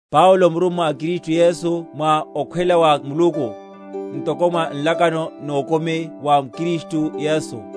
Paulo murummwa a Kristu Yesu mwa okhwela wa Muluku, ntoko mwa nlakano nokumi wa m’Kristu Yesu,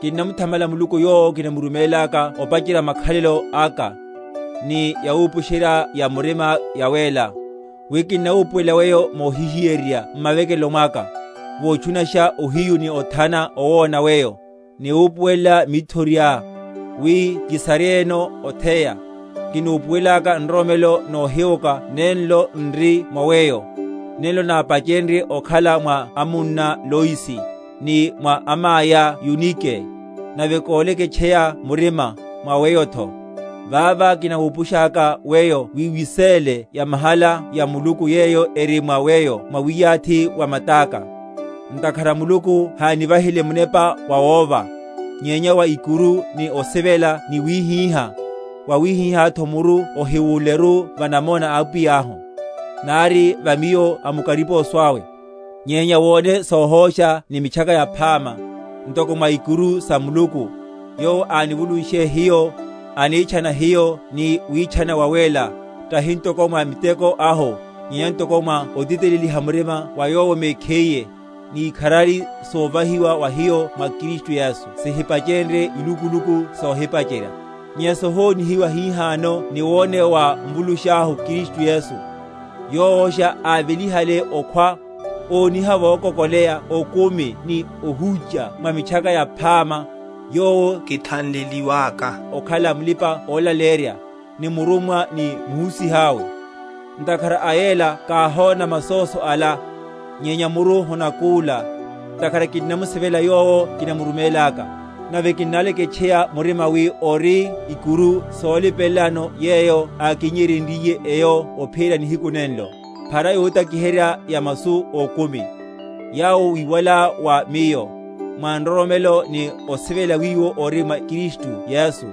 Kinnamuthamala Muluku, yowo kinamurumélaka opacherya makhalelo aka, ni yawupusherya‐ya‐murima yawéla, wi kinnawupuwela weyo mohihiyeryerya m’mavekelo mwaka, votchunasha ohiyu ni othana owona weyo, ni wupuwela mithoriá, wi kisaryeyeno otheya; kinupuwelaka nroromelo nohiwoka nenlo n’ri mwa weyo, nenlo nápachenrye okhala mwa amunná Loisi, ni mwa amaiá Yunike, nave, kóleketcheya murima, mwa weyotho. Vava kinawupushaka weyo wi wiséle yamahala ya Muluku, yeyo eri mwa weyo mwa wiyathi wa matáka. Ntakhara Muluku hánivahile Munepa wawóva; nyenya wa ikuru ni osivela ni wíhíha. Vawihihá muru ohiwúleru va namona a Apwiyahu, nari va miyo amukariposo awe; nyenya wone sohósha ni Mitchaka Yaphama, ntoko mwa ikuru sa Muluku; yowo ánivulunshe hiyo, anitchana hiyo ni witchana wawéla, tahi ntoko mwa miteko ahu, nyenya ntoko mwa otiteleliha murima wa Yowo mekhiye, ni ikharari, sovahiwa wa hiyo mwa Kristu Yesu sihipachenrye ilukuluku sohipacherya, nyenya sohonihiwa hihano ni woneya wa Mvulusháhu Kristu Yesu, yowosha ávelihale okhwa, óniha vokokoleya okumi ni ohúcha mwa Mitchaka Yaphama, yowo kithanleliwaka okhala mulipa‐olaleyerya, ni murummwa ni muhusiha awe. Ntakhara a yela káhona masóso ala; nyenya muru honakúla; ntakhara kinnamusivela Yowo kinamuroromelaka, nave kinnaleketcheya murima wi ori a ikuru solipelelano yeyo ákinnyeryenryiye eyo ophiyerya nihiku nenlo. Phara yotakiherya ya masu ókumi, yawo wíwalá wa miyo, mwa nroromelo ni osivela wiwo ori mwa Kristu Yesu.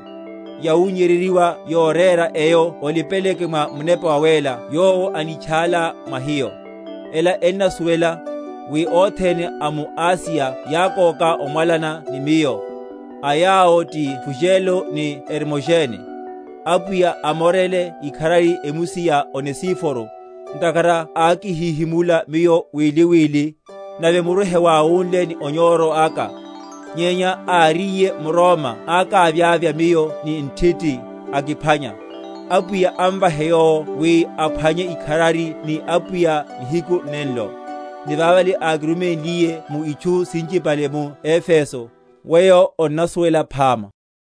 Yawunnyeryeryiwa yorera eyo olipeleleke mwa Munepa Wawéla yowo anítchála mwa hiyo. Ela onnasuwela, wi othene a mu Asiya yákóka omwalana ni miyo; a yawo ti Fugelo ni Hermogene. Apwiya amorele ikharari emusi ya Onesiforo; ntakhara ákihihimula miyo wili wili, nave muru hewáwúnle ni onyoro aka; nyenya áríye m’Roma ákavyavya miyo ni nthiti, akiphwanya. (Apwiya amvahe yowo wi aphwanye ikharari ni Apwiya nihiku nenlo); ni vavale ákiruménliye mu itchu sinchipale mu Efeso, weyo onnasuwela phama.